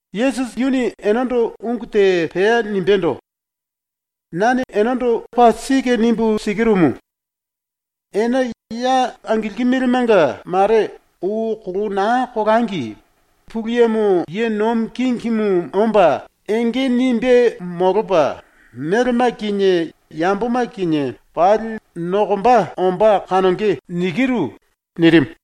Yesusi yuni enendo ungu te pea nimbendo: “Nane enendo paa sike nimbu sikirumu: Ene ya angilkimilimenga mare ou kolou naa kolangi Pulu Yemo ye nomi kingimu omba, enge nimbe molopa, melema kinie yamboma kinie pali nokomba ombá kanonge.” nirimu.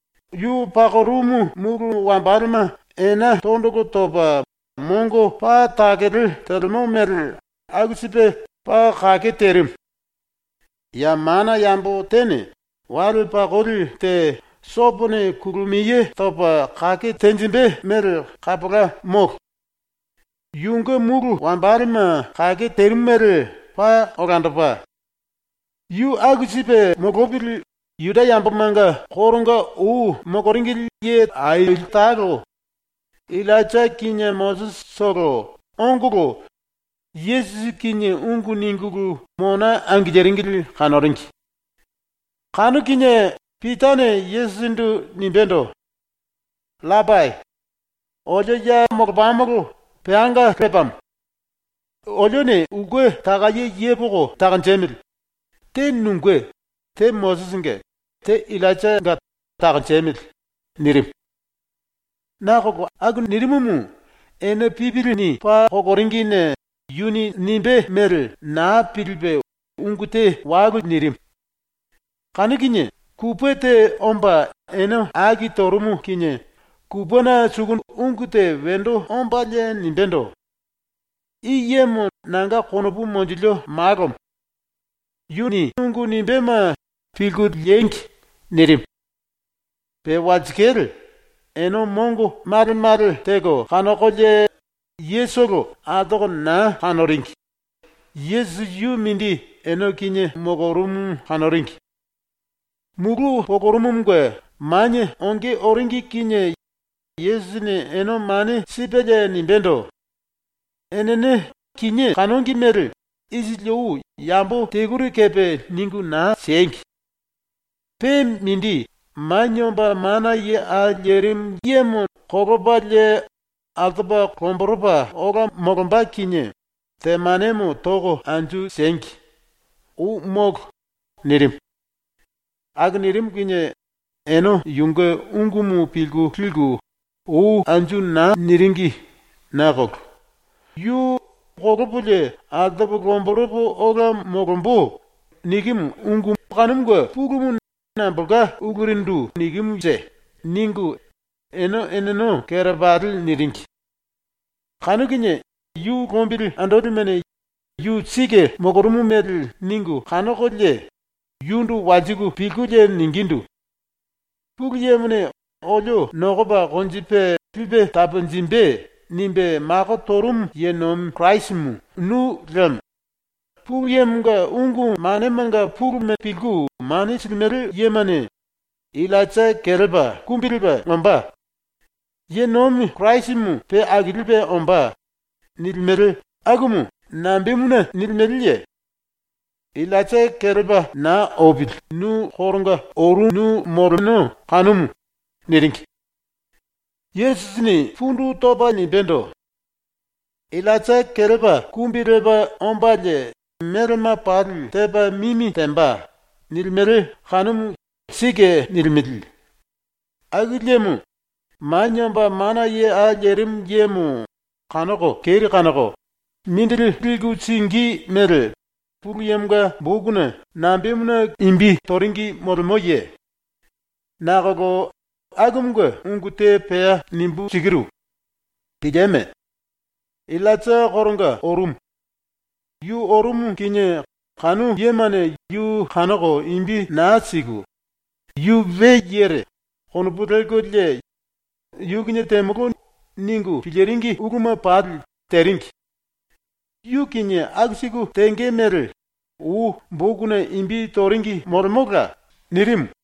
yu pakorumu mulu wambalema ena tondolo topa mongo paa takele telemo mele aku sipe paa kake terimu. Ya mana yambo tene wale pakoli te sopone kulumiye topa kake tenjimbe mele kapola molo. ⸤Yunge mulu wambalema kake terimu mele paa olandopa.⸥ Yu aku sipe molopili, ⸤Juda yambomanga koronga ou moloringili ye aili talo,⸥ Illainja kinie Mosisitolo ongolo Yesusi kinie ungu ningulu mona angiliringili kanoringi. Kanu kinie Pitane Yesusindu nimbendo: “Rapai, olio ya molopamolo peanga lepamo. Olione ulke takaye yepoko takonjemili. Te nunge, te Mosisinge, te Illainjanga takonjemili.” nirimu. (Nakolo aku nirimumu ene pipilini paa koloringine yuni nimbé mele naa pilipe ungu te walu nirimu.) Kanu kinie kupe te omba ene aki torumu kinie kupena suku ungu te wendo ombalie nimbendo: “I yemo nanga konopu monjilio Malomo. Yuni ungu nimbéma pilku liengi.” nirimu. Pe walsikale, ene mongo male male teko kanokolie yetolo altoko naa kanoringi. Yesusi yu mindi ene kinie molorumu kanoringi. Mulu polorumumunge manie onge oringi kinie Yesusini ene mane sipelie nimbendo: “Enene kinié kanongi mele isili ou yambo teluri kepe ningu naa siengi. Pe mindi, Manie Omba Mana Ye Au Lerimu Yemo kolopalie altopa lomboropa ola molomba kinie temanemo toko anju siengi. Ou molo!” nirimu. Aku nirimu kinie ene yunge ungumu pilku liku ou anju naa niringi nakolo “yu “kolopolie altopo lomboropo ola molombo.” nikimu ungu kanumunge pulumu nambolka ulurindu nikimunje?” ningu ene eneno kerepali niringi. Kanu kinie yu lombili andolimene ⸤yu sike molorumu mele ningu kanokolie⸥ yundu walsiku pilkulie ningindu: “⸤Pulu Yemone ‘olio nokopa konjipe lipe taponjimbe.’ nimbe mako torumu ye nomi Kirasimu nu liemo⸥ Pulu Yemonga ungu manemanga puluma pilku mane silimele yemane “Illainja ⸤kelepa⸥ kumbi lepa ombá. ⸤Ye nomi Kirasimu pe akilipe ombá.⸥” nilimele akumu nambemuna nilimeleye? ⸤Illainja kelepa naa opili nu koronga orunu moleno kanumu.⸥” niringi. Yesusini pundu topa nimbendo: “ “Illainja ⸤kelepa⸥ kumbi lepa ombalie melema pali tepa mimi temba.” nilimele kanumu sike nilimele. Aku liemo Manie Omba Mana Ye Au Lerimu Yemo kanoko keri kanoko mindili liku singí mele ⸤Pulu Yemonga⸥ bokuna nambemuna imbi toringi molemoye? Nakolo ⸤akumunge ungu te pea nimbu sikiru.⸥ Pilieme! Illainja koronga orumu. Yu orumu kinie ⸤kanu yemane yu kanoko imbi naa siku⸥ ‘yu we yere.’ konopu lelkolie ‘yu kinie temolo.’ ningu piliringi uluma pali teringi. Yu kinie aku siku tenge mele ou bokuna imbi toringi molemola.” nirimu.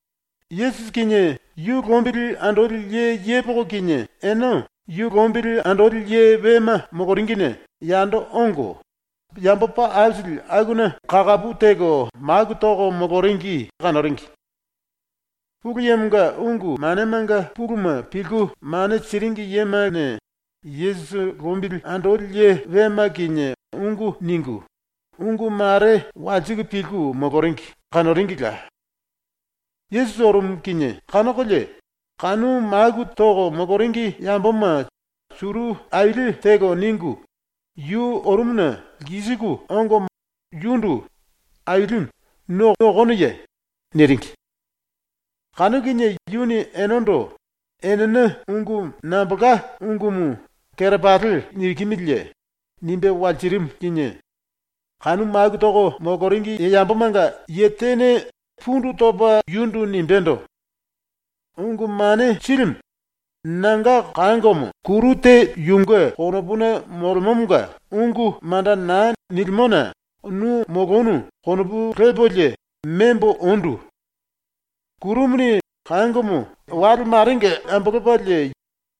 ⸤Yesusi kinie yu lombili andoli ye yepoko kinie⸥ ene yu lombili andoli ye wema moloringine yando ongo, yambo paa aisili akuna kakapu teko maku toko moloringi kanoringi. Pulu Yemonga ungu manemanga puluma pilku mane siringi yemane Yesusi lombili andoli ye wema kinie ungu ningu, ungu mare walsiku pilku moloringi kanoringila. Yesusi orumu kinie kanokolie kanu maku toko moloringi yamboma suru aili teko ningu yu orumuna lkisiku ongo yundu “⸤Ailimu,⸥ nu okonoye?” niringi. Kanu kinie yuni enendo “Enene ungu nambolka ungumu kerepali nikimiliye?” nimbe walsirimu kinie kanu maku toko moloringi yambomanga ye tene pundu topa yundu nimbendo: “Ungu Mane Silimu, nanga kangomo, kuru te yunge konopuna molemomonga ungu manda naa nilimona nu molonu ⸤konopu lepolie⸥ membo ondu. Kurumuni kangomo wale marenga ambolopalie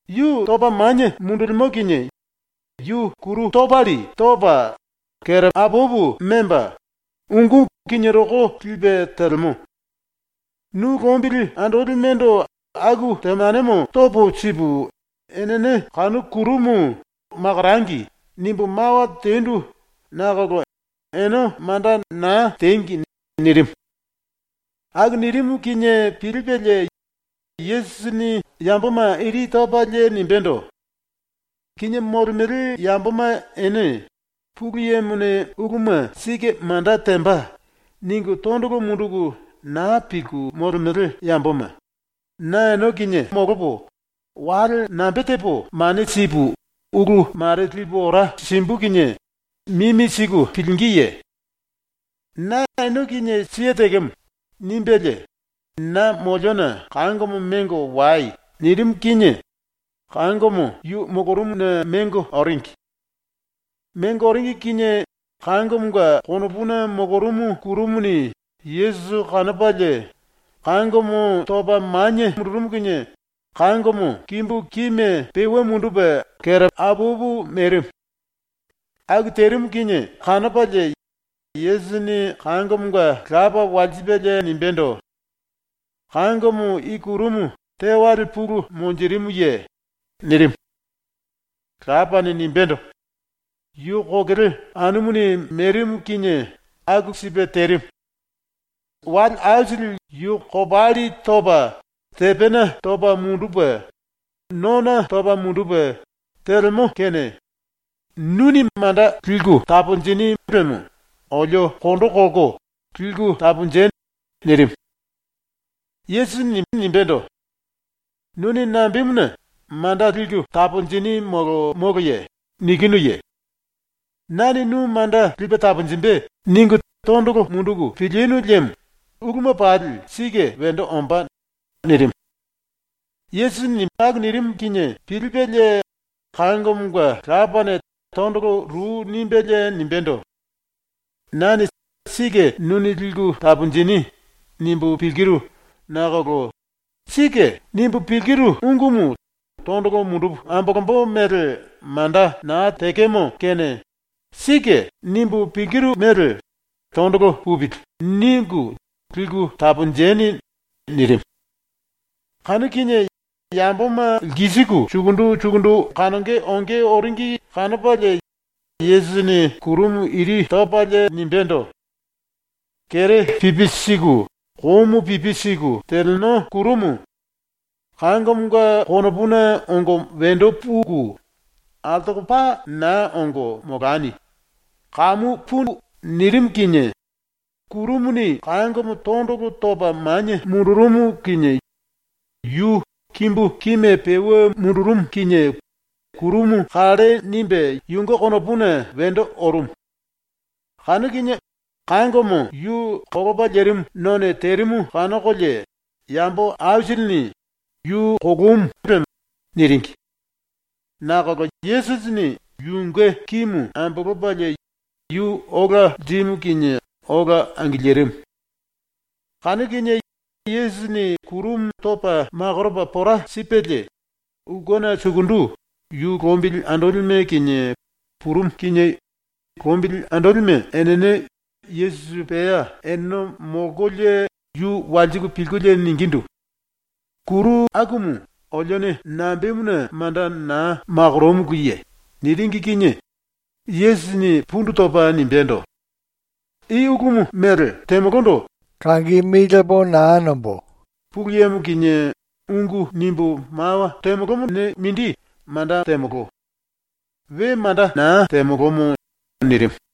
yu topa manie mundulimo kinie yu kuru kopalli topa, apapu memba, ungú kinirokó lipe telemo. Nu lombili andolimendo aku temanemo topo sipu enene kanu kurumu ‘Makorangi.’ nimbu mawa tendu nakolo ene manda naa tengi.” nirimu. Aku nirimu kinie pilipelie Yesusini yamboma ⸤iri topalie⸥ nimbendo: “Kinié molemele yamboma ene ⸤‘Pulu Yemone uluma sike manda temba.’ ningu⸥ tondolo munduku naa pilku molemele yamboma, na ene kinie molopo, wale nambe tepo mane sipu ulu mare lipu ora simbu kinie mimi siku pilingíye? ⸤Na ene kinie siye tekemo.⸥” nimbelie “Na moliona kangomo mengo wai.” nirimu kinie kangomo yu molorumuna mengo oringi. Mengo oringi kinie ⸤kangomonga konopuna molorumu⸥ kurumuni Yesusi kanopalie kangomo topa manie mundurumu kinie kangomo kimbu kime peue mundupe apapu merimu. Aku terimu kinie kanopalie Yesusini kangomonga lapa walsipelie nimbendo: “Kangomo i kurumu tewale pulu monjirimuye?” nirimu. Lapane nimbendo: “Yu kokele anumuni merimu kinie aku sipe terimu. Wale aisili yu kopalli topa tepena topa mundupe, nona topa mundupe telemo kene nuni manda liku taponjinu liemo olio kondo kolko liku taponji.” nirimu. Yesusini nimbendo: “Nuni nambemuna “Manda liku taponjini molo moloye?” nikinuye? ‘Nane nu manda lipe taponjimbe.’ ningu tondolo munduku pilinu liemo uluma pali sike wendo ombá.” nirimu. Yesusini aku nirimu kinie pilipelie kangomonga lapane tondolo ru nimbelie nimbendo: “Nane ‘sike nuni liku taponjini.’ nimbu pilkiru nakolo ‘Sike.’ nimbu pilkiru ungumu tondolo mundupu ambolombo mele manda naa tekemo kene ‘Sike.’ nimbu pilkiru mele ‘tondolo pupili.’ ningu liku taponjeni.” nirimu. ⸤Kanu kinie⸥ yamboma lkisiku sukundu sukundu kanonge onge oringi kanopalie Yesusini kurumu iri topalie nimbendo: “Kere pipi siku, komu pipi siku teleno kurumu, kangomonga konopuna ongo wendo puku, altoko paa naa ongo molani. Kamu pui!” nirimu kinie kurumuni kangomo tondolo topa manie mundurumu kinie yu kimbu kime peue mundurumu kinie kurumu kalle nimbe yunge konopuna wendo orumu. Kanu kinie kangomo yu kolopa lerimu none terimu kanokolie yambo aisilini “Yu kolomu.” niringi. Nakolo Yesusini yunge kimu ambolopalie yu ola lirimu kinie ola angilirimu. ⸤Kanu kinie Yesusini kurumu topa makoropa pora sipelie⸥ ulkena sukundu ⸤yu lombili andolime kinie⸥ purumu kinie lombili andolime enene Yesusi pea eneno molkolie yu walsiku pilkulie ningindu: “Kuru akumu olione nambemuna manda naa makoromuluye?” niringi kinie Yesusini pundu topa nimbendo: “I ulumu mele temolondo Pulu Yemo kinie ungu nimbu mawa temolomone mindi manda temolo. We manda naa temolomo.” nirimu.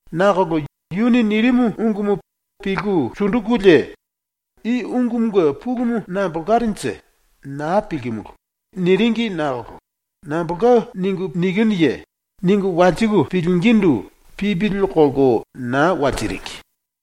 Nakolo yuni nirimu ungumu pilku sundukulie ‘I ungumunge pulumu nambolkarenje, naa pilkimulu.’ niringi nakolo “Nambolka ningu nikinuye?” ningu walsiku pilingindu pipili kolko naa walsiringi.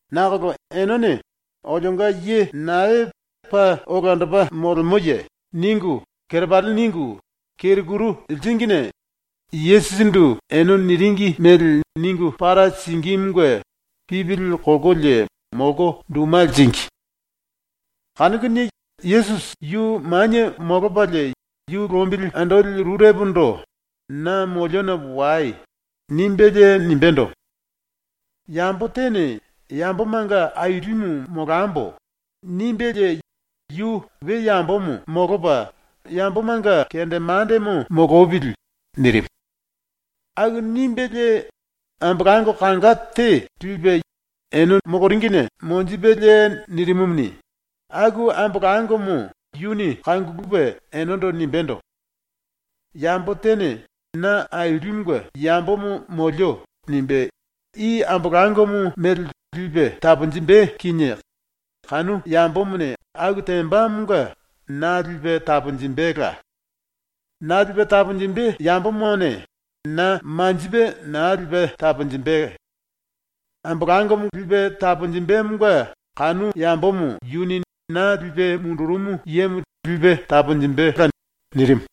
Nakolo enene ‘Olionga ye nae paa olandopa molemoye?’ ningu kerepali ningu keru kuru liringine Yesusindu ene niringi mele ningu para singímunge pipili kolkolie molko duma liringi. Kanu kinie Yesusi yu manie molopalie yu lombili andoli rurepondo “Na moliona wai.” nimbelie nimbendo: “Yambo tene ‘Yambomanga ailimu molambo.’ nimbelie yu we yambomo molopa yambomanga kendemandemo molopili.” nirimu. Aku nimbelie ambolango kanga te lipe ⸤yu lombili andolime⸥ angiliringine monjipelie nirimumuni, aku ambolangomo yuni kangulupe enendo nimbendo: “Yambo tene ‘Na Ailimunge yambomo molio.’ nimbe i ambolangomo mele lipe taponjimbe kinie kanu yambomone aku tembamonga na lipe taponjimbela. Na lipe taponjimbe yambomone na manjipe naa lipe taponjimbe. Ambolangomo lipe taponjimbemonga kanu yambomo yuni na lipe mundurumu yemo lipe taponjimbela.” nirimu.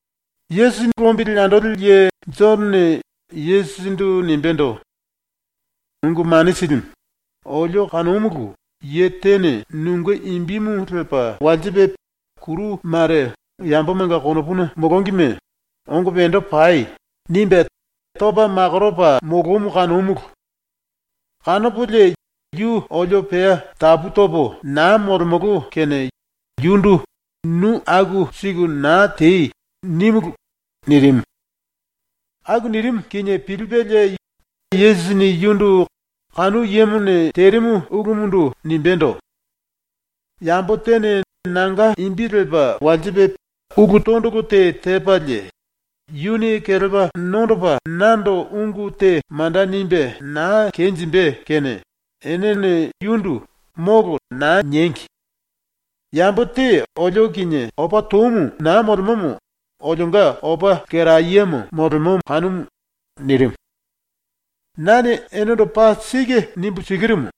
⸤Yesusi lombili andoli ye⸥ Jonone Yesusindu nimbendo: “Ungu Mane Silimu, olio kanomulu, ye tene nunge imbimu lepa kuru mare yambomanga konopuna molongime “Ongo wendo pai!” nimbe topa makoropa molomu kanomulu. Kanopolie yu olio pea tapu topo naa molemolo kene yundu “Nu aku siku naa tei!” nímulu.” nirimu. Aku nirimu kinie pilipelie Yesusini yundu ⸤kanu yemone terimu ulumundu⸥ nimbendo: “Yambo tene nanga imbi lepa ulu tondolo te tepalie yuni kelepa nondopa nando ungu te manda nimbe naa kenjimbe kene enene yundu “Molo!” naa niengi. Yambo te olio kinie opa toumu naa molemomo olionga opa lkerayemo molemo kanumu.” ⸤nirimu.⸥ “Nane enendo paa sike nimbu sikirumu: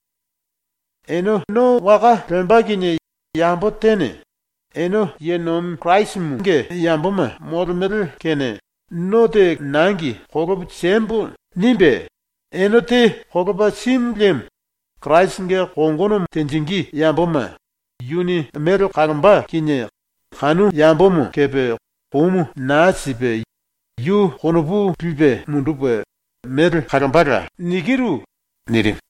Ene no waka lemba kinie yambo tene ‘Ene Kirasinge yamboma molemele kene no te nangi kolopo siembo.’ nimbe ene te kolopa simu liemo, Kirasinge kongono tenjingí yamboma yuni mele kalomba kinie kanu yambomo kepe komu naa sipe yu konopu lipe mundupe mele kalombala.” nirimu.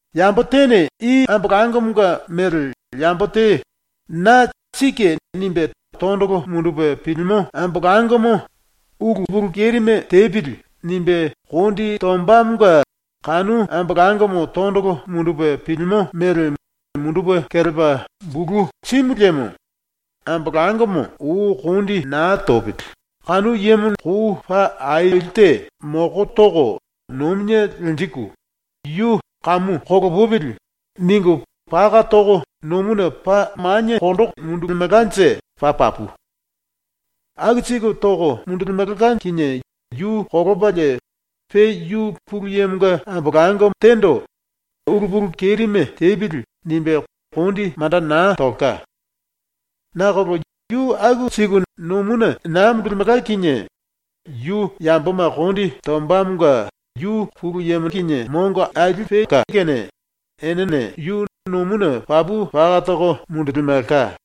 “Yambo tene i ambolangomonga ⸤mele yambo⸥ te na ‘Sike’ nimbe tondolo mundupe pilimo ambolangomo ‘Ulu kerime tepili.’ nimbe kondi tombamonga kanu ambolangomo tondolo mundupe pilimo mele mundupe kelepa bulu simu liemo ⸤ambolangomo ou kondi naa topili⸥ yu kou paa aili te moko toko nomine lenjiku ‘Yu kamu kolopupili.’ ningu paka toko nomuna paa maniekondo mundulimelkanje paa papu. Aku siku toko mundulimelka kinie yu kolopalie pe yu Pulu Yemonga ambolango tendo ‘Ulu kerime tepili.’ nimbe kondi manda naa tolka. Nakolo yu aku siku nomuna naa mundulimelka kinie yu yamboma kondi tombamonga Pulu Yemone yu mongo aili silke kene enene yu nomuna papu paka toko mundulimelka.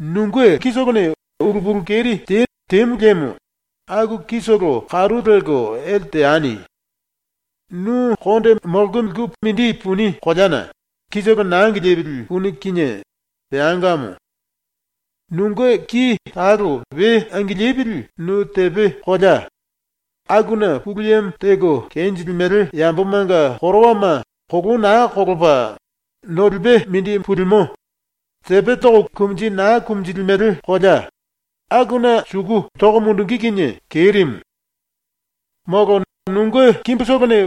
“Nunge kitolone ulu pulu keri te temu liemo aku kitolo karu lelko ele teani. Nu konde mololiku mindi puni koleana kitolo naa angilipili puni kinie peangamo. Nunge ki talo we angilipili nu tepe kolea, (‘akuna Pulu Yemo teko kenjilimele yambomanga korowama kolou naa kolopa nolipe mindi pulimo, tepe toko kumunji naa kumunjilimele kolea’) akuna suku toko mundungí kinie kerimu. “Molo nunge kimbutolone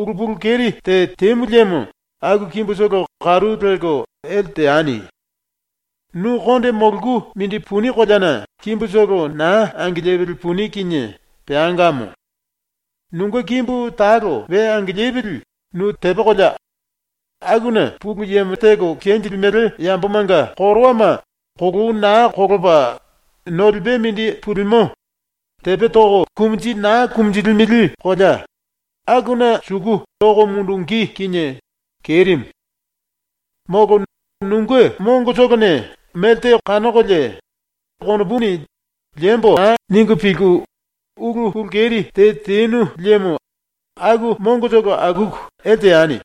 ulu pulu keri te temu liemo aku kimbutolo karu lelko ele teani. Nu konde mololiku mindi puni koleana kimbutolo naa angilipili puni kinie peangamo. Nunge kimbu talo we angilipili nu tepe kolea, (‘akuna Pulu Yemo teko kenjilimele yambomanga korowama kolou naa kolopa nolipe mindi pulimo, tepe toko kumunji naa kumunjilimele kolea’) akuna suku toko mundungí kinie kerimu. “Molo nunge mongotolone melte kanokolie konopuni ‘liembo.’ ningu pilku ulu pulu keri te tenu liemo aku mongotolo akuku ele teani.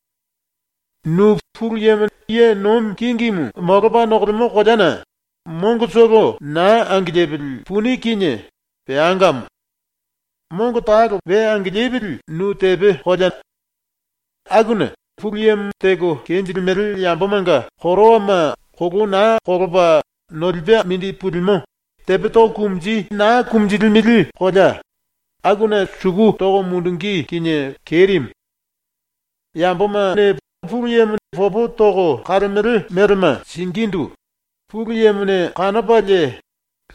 Nu Pulu Yemo ye nomi kingimu molopa nokolemo koleana mongotolo naa angilipili puni kinie peangamo. Mongo talo we angilipili nu tepe kolea, ‘akuna Pulu Yemo teko kenjilimele yambomanga korowama kolou naa kolopa nolipe mindi pulimo, tepe toko kumunji naa kumunjilimele kolea’ akuna suku toko mundungí kinie kerimu. “Yambomane Pulu Yemo popo toko kalemele melema singíndu ‘Pulu Yemone kanopalie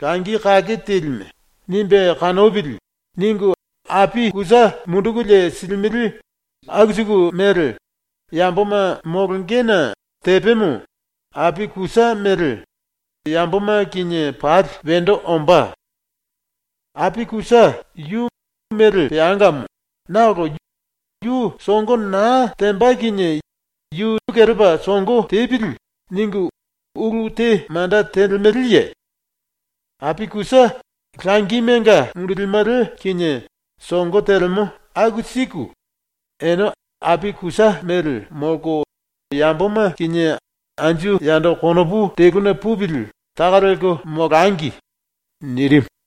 ‘Langi kake telime.’ nimbe kanopili.’ ningu api kusa mundukulie silimele aku siku mele yamboma molongena tepemo, api kusa mele, yamboma kinie pali wendo ombá. Api kusa yu mele peangamo nakolo yu songo naa temba kinie ‘Yu kelepa songo tepili.’ ningu ulu te manda telemeleye? ⸤Api kusa langimenga mundulimele kinie songo telemo aku siku⸥ ene api kusa mele molko yamboma kinie anju yando konopu teluna pupili taka lelko molangi.” nirimu.